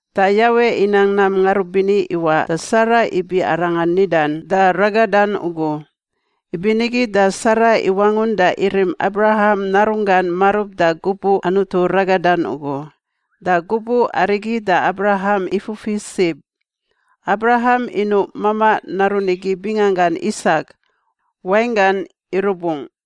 Da Yawe inang nam ngarubini iwaꞌ da Sara ibi arangan nidan da ragadan ugu. Ibinigi da Sara iwangun da irim Abraham narunggan marub da gubuꞌ Anutu ragadan ugu. Da gubuꞌ arigi da Abraham ifufi sib. Abraham inuꞌ mamaꞌ narun igi binganggan Isak (wainggan irubungꞌ).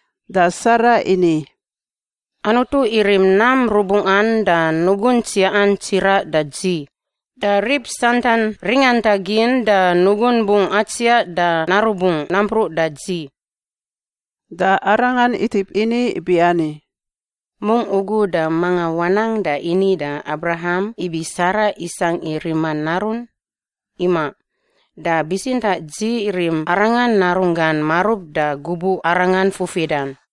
Da Sara ini, “Anutu irim nam rubungꞌan da nugun tsiaꞌan tsiraꞌ da dzi, da rib santan ringantagin da nugun bungꞌ atsiaꞌ da narubungꞌ nampruꞌ da dzi.” Da arangan itip ini ibiani, “Mungꞌ ugu da manga wanang da ini da Abraham ibi Sara isangꞌ i rima narun, imaꞌ. Da bitsintaꞌ dzi rim arangan narunggan marub da gubuꞌ arangan fufidan.”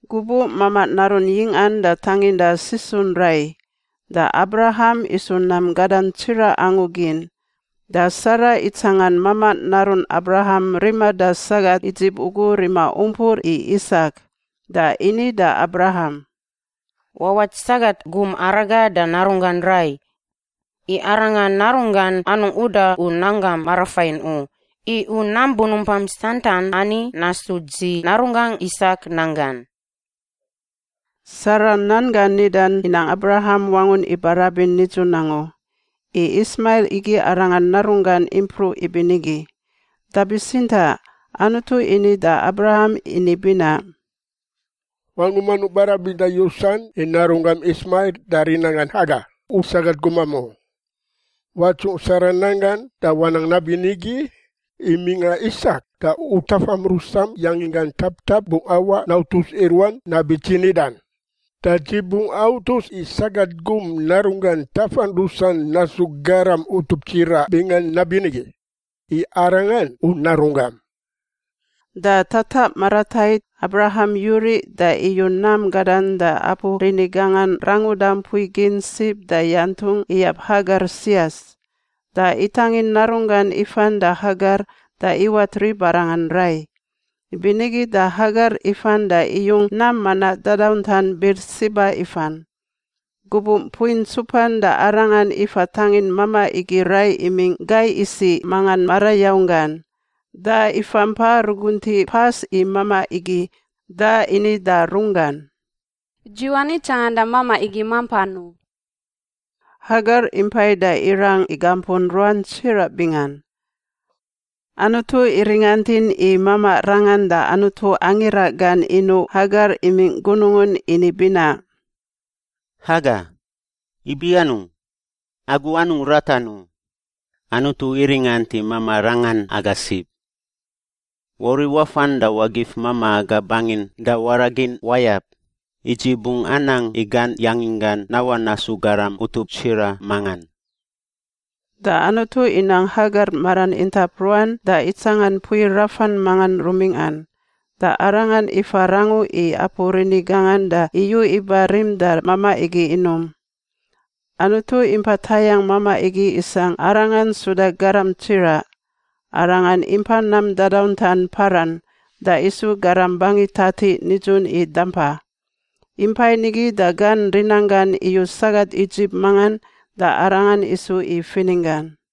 Gubuꞌ mamaꞌ narun yingꞌan da tanginda sisun rai, da Abraham isu nam gadan tsiraꞌ angu gin. Da Sara itsangan mamaꞌ narun Abraham rima da sagat Idzip ugu rima umpur i Isak da ini da Abraham, “Wawat sagat gum araga da narunggan rai. I arangan narunggan anungꞌ uda u nanggam marafain u, i u nam bunumpam santan ani nasu dzi narunggangꞌ Isak nanggan.” Sara nan gan nidan inang Abraham wangun ibarabin nidzun angu, i Ismail igi arangan narunggan impruꞌ ibinigi. Da bitsintaꞌ Anutu ini da Abraham ini binaꞌ, “Wangum anungꞌ barabinda yusan i narunggam Ismail da rinanggan Hagar, u sagat gumam, u. Watsungꞌ Sara nan gan da wanang nabinigi, i mingꞌa Isak da u tafam rusam yanginggan taptap bungꞌ awaꞌ nautus i ruan nabi dzi nidan. Da dzi bungꞌ autus i sagat gum narunggan tafan rusan nasu garam utup tsiraꞌ bingan nabinigi, i arangan u narunggam.” Da tataꞌ maratait, Abraham yuriꞌ da iyu nam gadan da apu rini gangan ranguda mpui gin sib da yantungꞌ iyab Hagar sias. Da itangin narunggan ifan da Hagar da iwat ribarangan rai. Ibinigi da Hagar ifan da iyung nam manaꞌ dadauntan Birsiba ifan. Gubuꞌ mpui ntsupan da arangan ifa tangin mamaꞌ igi rai imingꞌ gai isiꞌ mangan marayaung gan. Da ifampa ruguntiꞌ pas i mamaꞌ igi, da ini da runggan, “Dzi wani tsanganda mamaꞌ igi mampan u.” Hagar impai da irang igampun ruan tsiraꞌ bingan. Anutu iringantin i mamaꞌ rangan da Anutu angira gan inuꞌ Hagar imingꞌ gunungun ini binaꞌ, “Hagar! Ibi anungꞌ? Agu anungꞌ ratan u. Anutu iringant i mamaꞌ rangan aga sib. Wauriꞌ wafan da wagif mamaꞌ aga bangin da waraꞌ gin wayab, i dzi bungꞌ anang i gan yanginggan nawaꞌ nasu garam utup tsiraꞌ mangan.” Da Anutu inang Hagar maran intap ruan da itsangan mpui rafan mangan rumingꞌan. Da arangan ifa rangu i apu rini gangan da iyu iba rim da mamaꞌ igi inum. Anutu impa tayangꞌ mamaꞌ igi isangꞌ arangan suda garam tsiraꞌ. Arangan impa nam dadauntan Paran da isu garam bangi tatiꞌ nidzun i dampa. Impai nigi da gan rinanggan iyu sagat Idzip mangan da arangan isu i fininggan.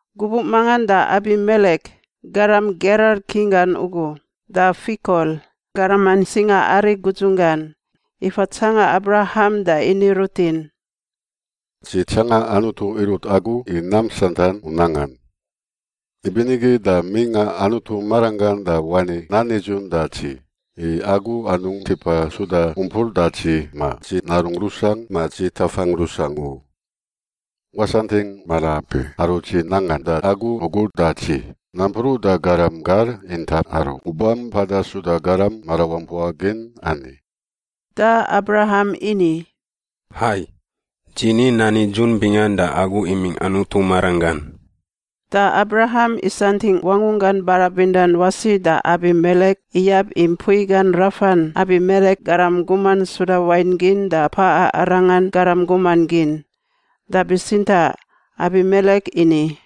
Gubuꞌ mangan da Abimelek (garam Gerar king gan ugu) da Fikol, garaman singaari gudzunggan, ifa tsanga Abraham da ini rutin, “Dzi tsanga Anutu irut agu i nam santan u nangan. Ibinigi da mingꞌa Anutu maranggan da wani nan nidzun da dzi i agu anungꞌ tipa suda umpur da dzi ma dzi narungꞌ rusangꞌ ma dzi tafangꞌ rusangꞌ u. Wasantingꞌ maraampi aru dzi nangan da agu ugu da dzi, nampruꞌ da garam gar intap aru u bampada suda garam marawampua gin ani.” Da Abraham ini, “Hai. Dzi ni nan nidzun bingan da agu imingꞌ Anutu maranggan.” Da Abraham isantingꞌ wangunggan barabindan wasi da Abimelek iyab i mpui gan rafan Abimelek garam guman suda wain gin da paꞌa arangan garam guman gin. Da bitsintaꞌ Abimelek ini,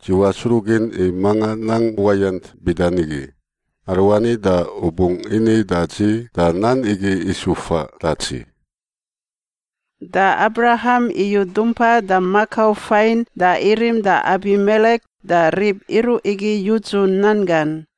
“Dzi wasruꞌgin i manga nang uwayant bida nigi. Aruani da u bungꞌ ini da dzi da nan igi isu faꞌ da dzi.” Da Abraham iyu dumpa da makau fain da irim da Abimelek da rib iruꞌ igi yudzu nan gan.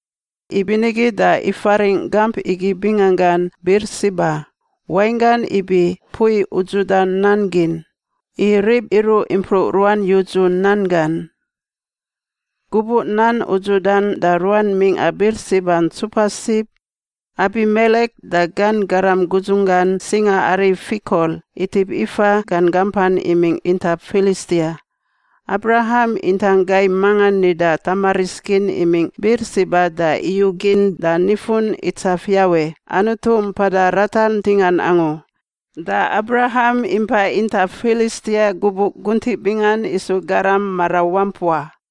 Ibinigi da ifaringꞌ gamp igi binganggan Birsiba (wainggan ibi mpui udzuda nan gin), i rib iruꞌ impruꞌ ruan yudzu nan gan. Gubuꞌ nan udzudan da ruan mingꞌa Birsiba ntsupa sib, Abimelek da gan garam gudzunggan singaari Fikol, itip ifa gan gampan imingꞌ intap Filistia. Abraham intang gai mangan nida tamaris gin imingꞌ Birsiba da iyugin da nifun itsaf Yawe, Anutu Mpada Ratar Ntingan Angu. Da Abraham impa intap Filistia gubuꞌ guntiꞌ bingan isu garam marawampua.